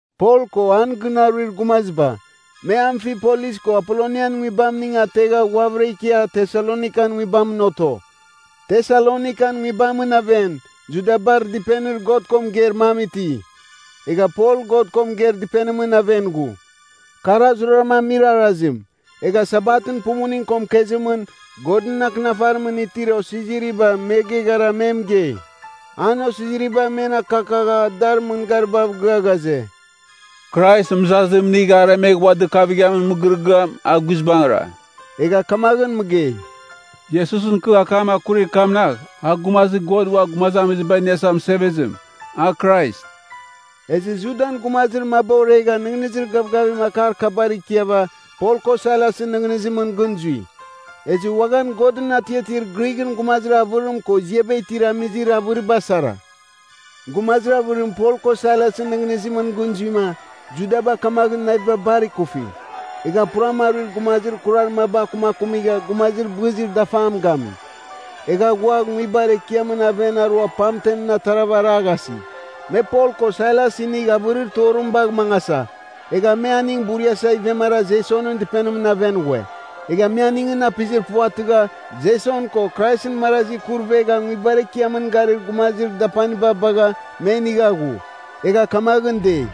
Pol ko an gɨn aruir gumaziba, me Amfipolis ko Apolonian nguibamning ategha ghuavɨra ikia Tesalonikan nguibamɨn oto. Tesalonikan nguibamɨn aven, Judabar dɨpenir God ko mɨgeir mam iti. Egha Pol God ko mɨgeir dɨpenimɨn aven ghu. Kar a zuraram amir arazim. Egha Sabatɨn pumuning ko mɨkezimɨn Godɨn Akɨnafarimɨn itir osiziriba me geghara me mɨgei. An osiziriba men akakagha dar mɨngaribav gɨa ghaze, “Krais mɨzazim inigh aremegh ua dɨkavamin mɨgɨrɨgɨam, a guizbangɨra.” Egha kamaghɨn mɨgei, “Iesusɨn kɨ akam akurir kamnagh, a Gumazir God Ua Gumazamiziba Iniasa Mɨsevezim, a Krais.” Ezɨ Judan gumazir maba oregha nɨghnɨzir gavgavim akar kabar ikiava Pol ko Sailasɨn nɨghnɨzimɨn gɨn zui. Ezɨ uaghan Godɨn atiatir Grighɨn gumazir avɨrim ko ziaba itir amizir avɨriba sara. Gumazir avɨrim Pol ko Sailasɨn nɨghnɨzimɨn gɨn zuima, Judaba kamaghɨn naviba bar ikufi. Egha puram aruir gumazir kurar maba akumakumigha gumazir bɨzir dafam gami. Egha ghua nguibar ekiamɨn aven arua pamtem atarava araghasi. Me Pol ko Sailas inigh avɨrir torim bagh mangasa, egha me aning buriasa ivemara Jesonɨn dɨpenimɨn aven ghue. Egha me aningɨn apizir puvatɨgha, Jeson ko Kraisɨn marazi kurɨvegha nguibar ekiamɨn garir gumazir dapaniba bagha me inigha ghu. Egha kamaghɨn dei,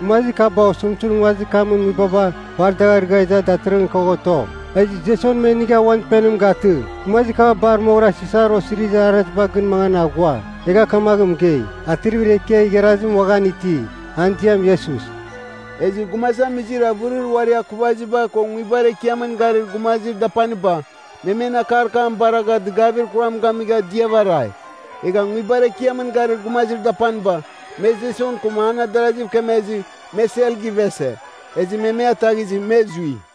“Gumazir kaba osɨmtɨzim nguazir kamɨn nguibaba bar dagh arɨgha iza datɨrɨghɨn kagh oto. Ezɨ Jeson me inigha uan dɨpenim gatɨ. Gumazir kaba bar moghɨra Sisar osirizir arazibar gɨn mangan aghua. Egha kamagh mɨgei, Atrivir ekiar igharazim uaghan iti, an ziam Iesus.” Ezɨ gumazamizir avɨrir uari akuvaziba ko nguibar ekiamɨn garir gumazir dapaniba, me men akar kam baragha dɨgavir kuram gamigha diava arai. Egha nguibar ekiamɨn garir gumazir dapaniba, me Jeson ko an adaraziv kemezɨ, me sel givese. Ezɨ me me ataghizɨ, me zui.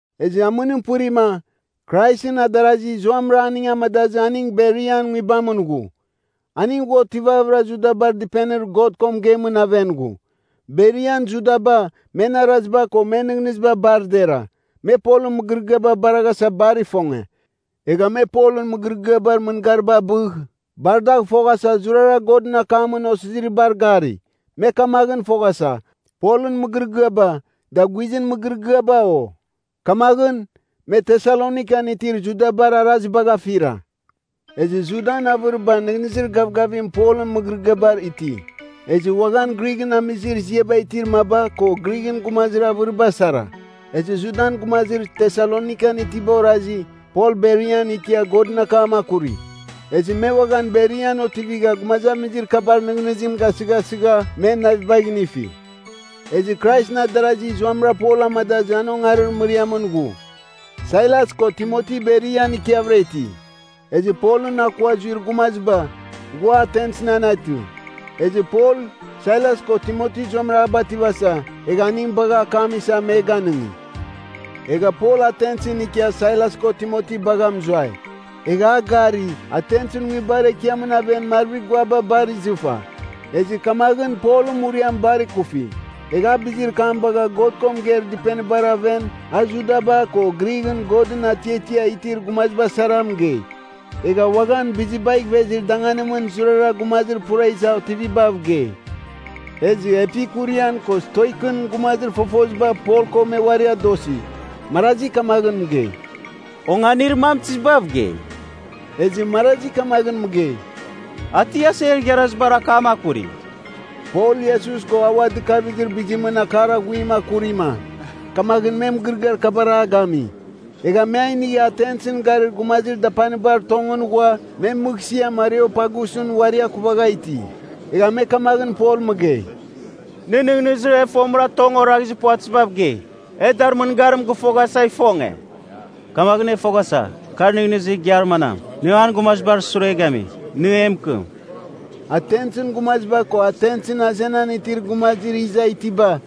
Ezɨ amɨnim pɨrima, Kraisɨn adarazi zuamɨra aning amadazɨ aning Berian nguibamɨn ghu. Aning ghua otivavɨra Judabar dɨpenir God ko mɨgeimɨn aven ghu. Berian Judaba, men araziba ko men nɨghnɨziba bar dera. Me Polɨn mɨgɨrɨgɨaba baraghasa bar ifonge. Egha me Polɨn mɨgɨrɨgɨabar mɨngariba abɨgh bar dagh fofoghasa zurara Godɨn Akamɨn Osiziribar gari. Me kamaghɨn foghasa, Polɨn mɨgɨrɨgɨaba, da guizɨn mɨgɨrɨgɨaba, o? Kamaghɨn, me Tesalonikan itir Judabar arazibagh afira. Ezɨ Judan avɨriba nɨghnɨzir gavgavim Polɨn mɨgɨrɨgɨabar iti. Ezɨ uaghan Grighɨn amizir ziaba itir maba ko Grighɨn gumazir avɨriba sara. Ezɨ Judan gumazir Tesalonikan itiba orazi, Pol Berian ikia Godɨn akam akuri. Ezɨ me uaghan Berian otivigha gumazamizir kabar nɨghnɨzim gasɨghasɨgha men navibagh inifi. Ezɨ Kraisɨn adarazi zuamɨra Pol amadazɨ an ongarir mɨriamɨn ghu. Sailas ko Timoti Berian ikiavɨra iti. Ezɨ Polɨn akua zuir gumaziba, ghua Atensɨn anetɨ. Ezɨ Pol, Sailas ko Timoti zuamɨra a bativasa, egha aning bagha akam isa me ganɨngi. Egha Pol Atensɨn ikia Sailas ko Timoti bagha mɨzuai. Egha a gari, Atensɨn nguibar ekiamɨn aven marvir guaba bar izɨfa. Ezɨ kamaghɨn Polɨn muriam bar ikufi. Egha a bizir kam bagha God ko mɨgeir dɨpenibar aven a Judaba ko Grighɨn Godɨn atiatia itir gumaziba sara mɨgei. Egha uaghan bizibagh ivezir danganimɨn zurara gumazir pura iza otivibav gei. Ezɨ Epikurian ko Stoikɨn gumazir fofoziba Pol ko me uari adosi. Marazi kamagh mɨgei, “Onganir mam tizibav gei?” Ezɨ marazi kamagh mɨgei, “A ti aser igharazibar akam akuri.” Pol Iesus ko a ua dɨkavizir bizimɨn akar aghuim akurima, kamaghɨn me mɨgɨrɨgɨar kabar a gami. Egha me a inigha Atensɨn garir gumazir dapanibar tongɨn ghua me mɨghsɨamɨn Areopagus uari akuvagha iti. Egha me kamaghɨn Pol mɨgei, “Nɨ nɨghnɨzir e fomɨra tong oraghizir puvatɨzibav gei. E dar mɨngarim gɨfoghasa ifonge. Kamaghɨn e foghasa, kar nɨghnɨzir igiar manam, nɨ an gumazibar sure gami. Nɨ e mɨkɨm.” (Atensɨn gumaziba ko Atensɨn azenan itir gumazir iza itiba,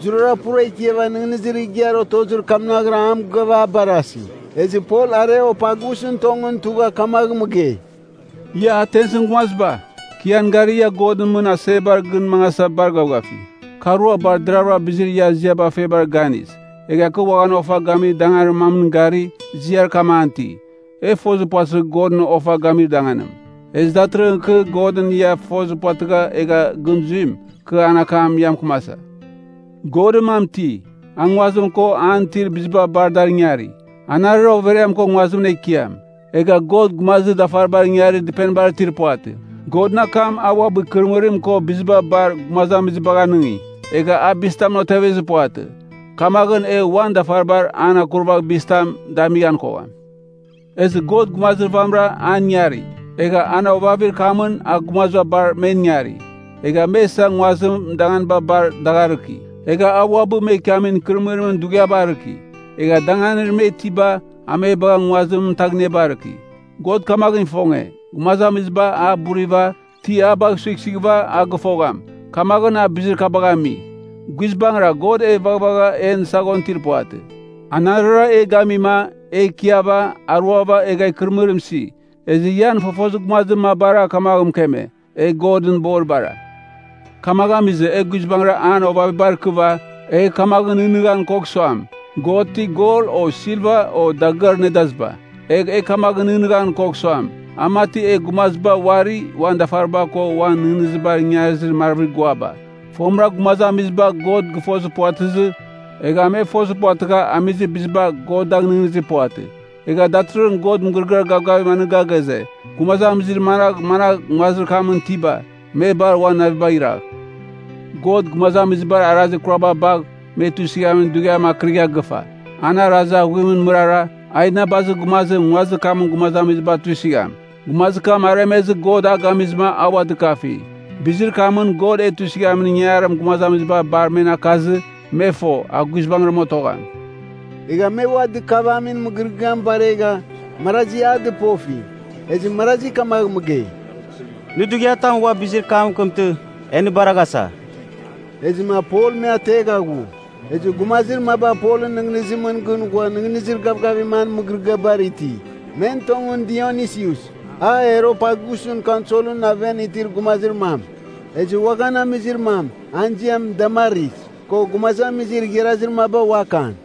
zurara pura ikiava nɨghnɨzir igiar otozir kamnaghra a mɨgɨava a barasi.) Ezɨ Pol Areopagusɨn tongɨn tugha kamagh mɨgei, “Ia Atensɨn gumaziba! Kɨ ian gari, ia godɨn mɨn asebar gɨn mangasa bar gavgafi. Kɨ arua bar deravɨra bizir ia ziaba febar ganis, egha kɨ uaghan ofa gamir danganir mamɨn gari, ziar kam an iti: e fozir puvatɨzir godɨn ofa gamir danganim. Ezɨ datɨrɨghɨn kɨ, godɨn ia fozir puvatɨgha egha gɨn zuim, kɨ an akam ia mɨkɨmasa. “Godɨn mam iti, a nguazir kam ko an itir biziba bar dar ingari, anarɨra overiam ko nguazimɨn Ekiam. Egha God gumazir dafaribar ingarir dɨpenibar itir puvatɨ. Godɨn kam a uabɨ ikɨrɨmɨrim ko biziba bar gumazamizibagh anɨngi. Egha a bizitamɨn otevezir puvatɨ. Kamaghɨn e uan dafaribar an akurvagh bizitam damighan kogham. Ezɨ God gumazir vamɨra an ingari, egha an ovavir kamɨn a gumaziba bar men ingari. Egha me isa nguazimɨn danganiba bar dagh arɨki. Egha a uabɨ me ikiamin ikɨrɨmɨrimɨn dughiaba arɨki. Egha danganir me itiba a me bagha nguazir mɨtaghniaba arɨki. God kamaghɨn ifonge, gumazamiziba a buriva, ti a bagh suighsuighɨva a gɨfogham, kamaghɨn a bizir kabagh ami. Guizbangɨra God e vaghvagha en saghon itir puvatɨ. ‘Anarɨra e gamima, e ikiava, aruava egha ikɨrɨmɨrim isi.’ Ezɨ ian fofozir gumazir mabara kamaghɨn mɨkeme, ‘E Godɨn boribara.’ “Kamaghɨn amizɨ, e guizbangɨra an ovavibar ikiava, egh kamaghɨn nɨghnɨghan kogh suam, God ti gol o silva o dagɨar nedaziba. Egh e kamaghɨn nɨghnɨghan kogh suam, a mati e gumaziba uari uan dafariba ko uan nɨghnɨzibar ingarizir marvir guaba. “Fomɨra gumazamiziba God gɨfozir puvatɨzɨ, egha me fozir puvatɨgha amizir biziba God dagh nɨghnɨzir puvatɨ. Egha datɨrɨghɨn God mɨgɨrɨgɨar gavgavim anɨga ghaze, gumazamizir managh managh nguazir kamɨn itiba, me bar uan navibagh iragh. God gumazamizibar arazir kuraba bagh me tuisɨghamin dughiam akɨrigha gɨfa. An arazir aghuimɨn mɨrara, a inabazir gumazim nguazir kamɨn gumazamiziba tuisɨgham. Gumazir kam aremezɨ God a gamizɨma a ua dɨkafi. Bizir kamɨn God e tuisɨghamin ingangarim gumazamiziba bar men akazɨ, me fo, a guizbangɨra otogham.” Egha me ua dɨkavamin mɨgɨrɨgɨam baregha, marazi a dɨpofi. Ezɨ marazi kamagh mɨgei, “Nɨ dughiatam ua bizir kam mɨkɨmtɨ, e nɨ baraghasa.” Ezɨma Pol me ategha ghu. Ezɨ gumazir maba Polɨn nɨghnɨzimɨn gɨn ghua nɨghnɨzir gavgavim an mɨgɨrɨgɨabar iti. Men tongɨn Dionisius, a Areopagus kaunselɨn aven itir gumazir mam. Ezɨ uaghan amizir mam, an ziam Damaris, ko gumazamizir igharazir maba uakan.